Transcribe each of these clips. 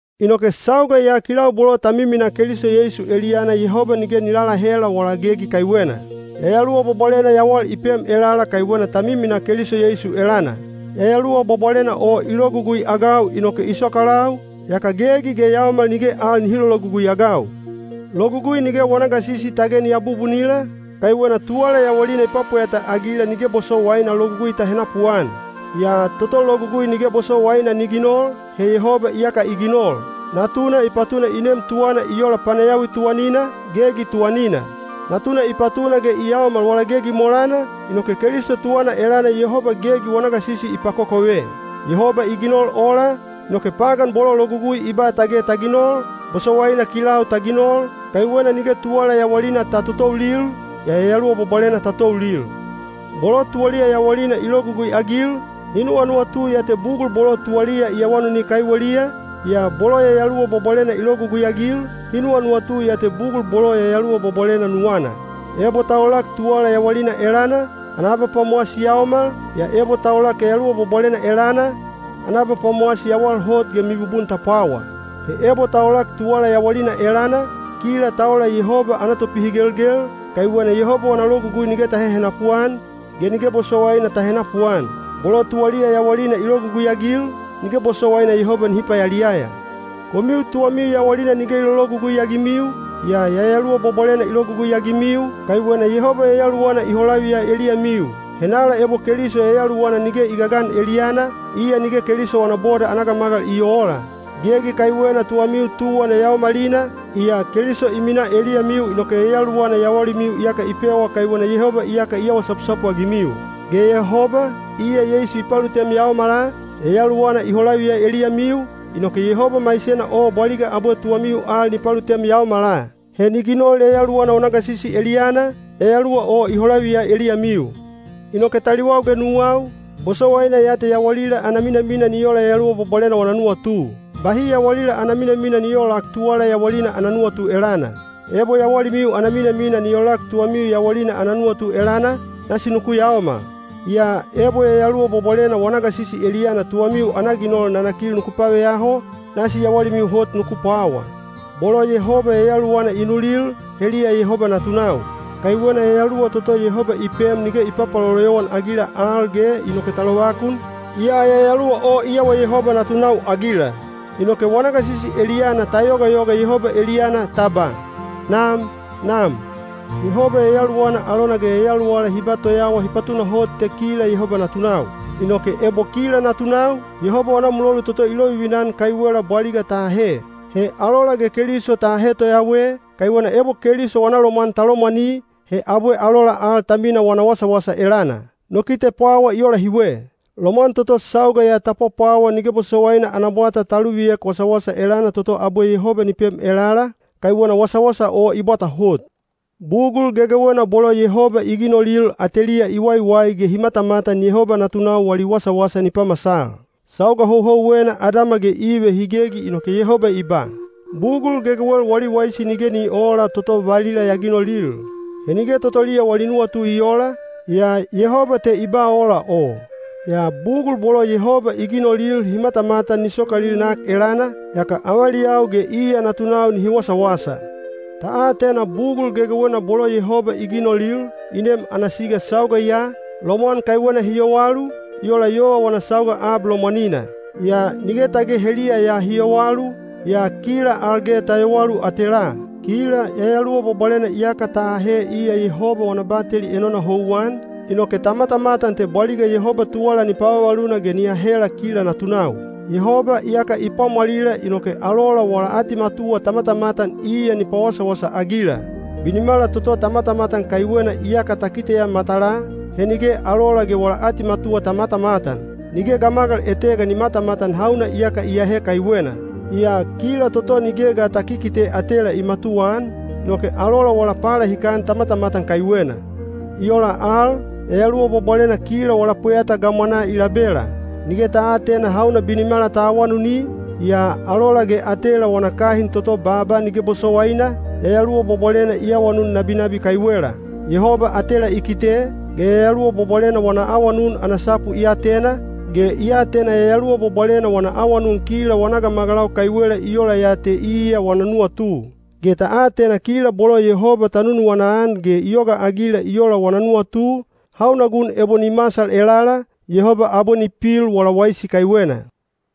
Inoke sauga ya kilau bolo ta miminaa Keliso Yeisu eliyana Yehoba nige ni lalahela wala gegi kaiwena. Yayaluwa Bwabwalena yawal i pem elala kaiwena ta miminaa Keliso Yeisu elana. Yayaluwa Bwabwalena o i logugui-agau inoke i sokalau, yaka gegi ge yaomal nige al nihi lologugui-agau. Logugui nige wana gasisi tage ni abubunila, kaiwena tuwala yawalina i pwapweyata-agila nige bosowaina Logugui ta henapuan. Yaa toto Logugui nige bosowaina ni ginol, he Yehoba iyaka i ginol. Natuna i patuna i nem tuwana i ola panayawi tuwanina, gegi tuwanina. Natuna i patuna ge i yaomal wala gegi molana, inoke Keliso tuwana elana Yehoba gegi wana gasisi i pakokove. Yehoba i ginol ola, inoke pagan bolo Logugui i ba tage ta ginol, bosowaina kilau ta ginol, kaiwena nige tuwala yawalina ta totoulil, yaa Yayaluwa Bwabwalena ta toulil. Bolo tuwaliya yawalina i logugui-agil, hi nuwanuwatu ya te bugul bolo tuwaliya i awanuni kaiweliya, yaa bolo Yayaluwa Bwabwalena i logugui-agil, hi nuwanuwatu ya te bugul bolo Yayaluwa Bwabwalena nuwana. Ebo ta olak tuwala yawalina elana, ana abapwamowasi yaomal, yaa ebo ta olak Yayaluwa Bwabwalena elana, ana abapwamowasi yawal hot ge mibubun ta pwawa. He ebo ta olak tuwala yawalina elana, kila ta ola Yehoba ana topihigelgel, kaiwena Yehoba wana logugui nige ta hehenapu-an, ge nige bosowaina ta henapuan. Bolo tuwaliya yawalina i logugui-agil, nige bosowaina Yehoba nihi payaliyaya. Komiu tuwamiu yawalina nige i lologugui-agimiu, yaa Yayaluwa Bwabwalena i logugui-agimiu, kaiwena Yehoba Yayaluwana i holaviya eliyamiu. Henala ebo Keliso Yayaluwana nige i gagan eliyana, iya nige Keliso wana boda ana gamagal i oola. Gegi kaiwena tuwamiu tuwan yayaomalina, yaa Keliso i minaa eliyamiu inoke Yayaluwana yawalimiu iyaka i pewa kaiwena Yehoba iyaka i awa sapusapu-agimiu. Ge Yehoba, iya Yeisu i palutem yaomala, Yayaluwana i holaviya eliyamiu, inoke Yehoba maisena o bwaliga abwe tuwamiu al ni palutem yaomala. He ni ginol Yayaluwana wana gasisi eliyana, Yayaluwa o i holaviya eliyamiu. Inoke taliwau ge nuwau, bosowaina ya te yawalila ana minamina ni ola Yayaluwa Bwabwalena wana nuwatu. Bahi yawalila ana minamina ni oolak tuwala yawalina ana nuwatu elana. Ebo yawalimiu ana minamina ni olak tuwamiu yawalina ana nuwatu elana, nasi nuku yaomal. Yaa ebo Yayaluwa Bwabwalena wana gasisi eliyana tuwamiu ana ginol nanakil nuku paveyaho, nasi yawalimiu hot nuku pwawa. Bolo Yehoba Yayaluwana i nulil, heliya Yehoba natunau. Kaiwena Yayaluwa toto Yehoba i pem nige i papaloloyowan-agila al ge inoke ta lovakun, yaa Yayaluwa o i awa Yehoba natunau-agila. Inoke wana gasisi eliyana ta yogayoga Yehoba eliyana ta ba, “Nam! Nam!” Yehoba Yayaluwana alona ge yayaluwala hi ba toyawa hi patunahot te kila Yehoba natunau. Inoke ebo kila natunau, Yehoba wana mulolu toto i lovivina-an kaiwela bwaliga ta ahe. He alola ge Keliso ta ahe toyawe, kaiwena ebo Keliso wana lomwan ta lomwani, he abwe alola al ta mina wana wasawasa elana. No kite pwawa i ola hiwe: lomwan toto sauga ya ta pwapwawa nige bosowaina ana bwata ta luviek wasawasa elana toto abwe Yehoba ni pem elala, kaiwena wasawasa o i bwata hot. Bugul gegewena bolo Yehoba i ginolil ateliya i waiwai ge hi matamatan Yehoba natunau wali wasawasa ni pamasal. Sauga houhouwena Adama ge Ive hi gegi inoke Yehoba i ba, “Bugul gegewel wali waisi nige ni oola toto valila ya ginolil.” He nige totoliya wali nuwatu i oola, yaa Yehoba te i ba ola o. Yaa bugul bolo Yehoba i ginolil hi matamatan ni sokalil nak elana, yaka avaliyau ge iya natunau nihi wasawasa. Ta atena bugul gegewena bolo Yehoba i ginolil, i nem ana siga sauga ya, lomwan kaiwena hi yowalu, i ola yova wana sauga ab lomwanina. Yaa nige tage heliya ya hi yowalu, yaa kila al ge ta yowalu atelaa. Kila Yayaluwa Bwabwalena iyaka ta ahe iya Yehoba wana bateli enona houwan, inoke ta matamatan te bwaliga Yehoba tuwala ni pavavaluna ge ni ahela kila natunau. Yehoba iyaka i pwamwalila inoke alola wala atimatuwa ta matamatan iya ni pawasawasa-agila. Binimala toto ta matamatan kaiwena iyaka ta kiteya matalaa, he nige alola ge wala atimatuwa ta matamatan. Nige gamagal etega ni matamatan hauna iyaka i ahe kaiwena. Yaa kila toto nige ga ta kikite atela i matuwaan, inoke alola wala palahikan ta matamatan kaiwena. I ola al, Yayaluwa Bwabwalena kila wala pweyata gamwanaa i labela. Nige ta aatena hauna binimala ta awanuni, yaa alola ge atela wana kahin toto baaba nige bosowaina, Yayaluwa Bwabwalena i awanun nabinabi kaiwela. Yehoba atela i kite, ge Yayaluwa Bwabwalena wana awanun ana sapu i atena, ge i atena Yayaluwa Bwabwalena wana awanun kila wana gamagalau kaiwela i ola ya te iya wana nuwatu. Ge ta atena kila bolo Yehoba ta nunuwana-an ge i yogaagila i ola wana nuwatu, hauna gun ebo ni masal elala, Yehoba abwe ni pil wala waisi kaiwena.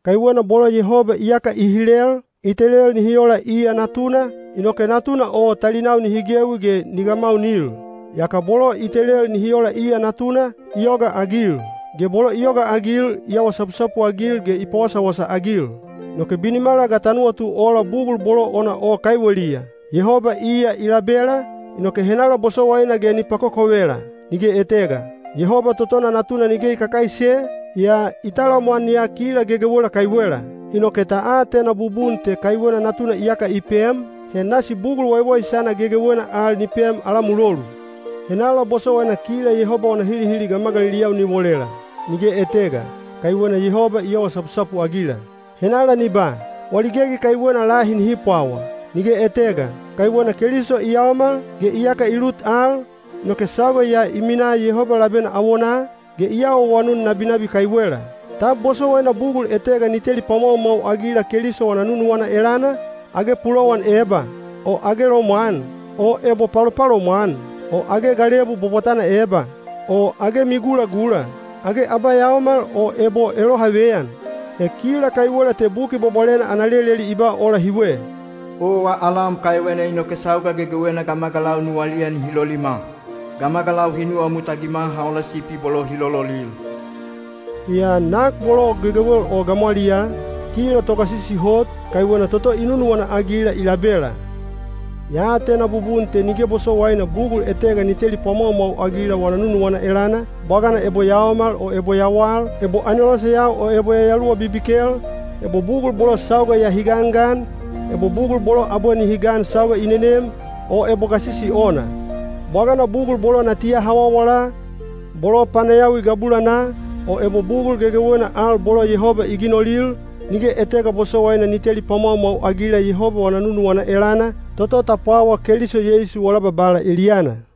Kaiwena bolo Yehoba iyaka i hilel, i telel nihi ola iya Natuna, inoke Natuna o talinau nihi gewi ge ni gamaunil. Yaka bolo i telel nihi ola iya Natuna, i yogaagil; ge bolo i yogaagil i awa sapusapu-agil ge i pawasawasa-agil. Inoke binimala ga ta nuwatu ola bugul bolo ona o kaiweliya? Yehoba iya i labela, inoke henala bosowaina ge ni pakokovela? Nige etega. Yehoba totona Natuna nige i kakaise, yaa i talamwan ya kila gegewela kaiwela. Inoke ta atena bubun te kaiwena Natuna iyaka i pem, he nasi bugul waiwaisana gegewena al ni pem ala mulolu. Henala bosowaina kila Yehoba wana hilihili gamagaliliyau ni wolela? Nige etega, kaiwena Yehoba i awa sapusapu-agila. Henala ni ba, “Wali gegi kaiwena lahi nihi pwawa”? Nige etega, kaiwena Keliso i yaomal, ge iyaka i lut al, inoke sauga ya i minaa Yehoba labena awonaa, ge i awaawanun nabinabi kaiwela. Tab bosowaina bugul etega ni teli pwamwaumwau-agila Keliso wana nunuwana elana? Age pulowan eba? O age lomwan? O ebo palopalomwan? O age galebu bwabwatana eba? O age migulagula? Age abayaomal o ebo elohaveyan? He kila kaiwela te Buki Bwabwalena ana leleli i ba ola hiwe: Owa alam kaiwena inoke sauga gegewena gamagalau nuwaliya nihi lolima. Gamagalau hi nuwamut-agima ha ola sipi bolo hi lololil. Yaa nak bolo gegewel o gamwaliyaa, kila togasisi hot, kaiwena toto i nunuwana-agila i labela. Ya atena bubun te nige bosowaina bugul etega ni teli pwamwaumwau-agila wana nunuwana elana, bwagana ebo yaomal o ebo yawal, ebo aneloseyau o ebo yayaluwa bibikel, ebo bugul bolo sauga ya hi gangan, ebo bugul bolo abwe nihi gan sauga i nenem, o ebo gasisi ona. Bwagana bugul bolo natiya hawawala, bolo panayawi gabulanaa, o ebo bugul gegewena al bolo Yehoba i ginolil, nige etega bosowaina ni teli pwamwaumwau-agila Yehoba wana nunuwana elana, toto ta pwawaa Keliso Yeisu wala Babala eliyana.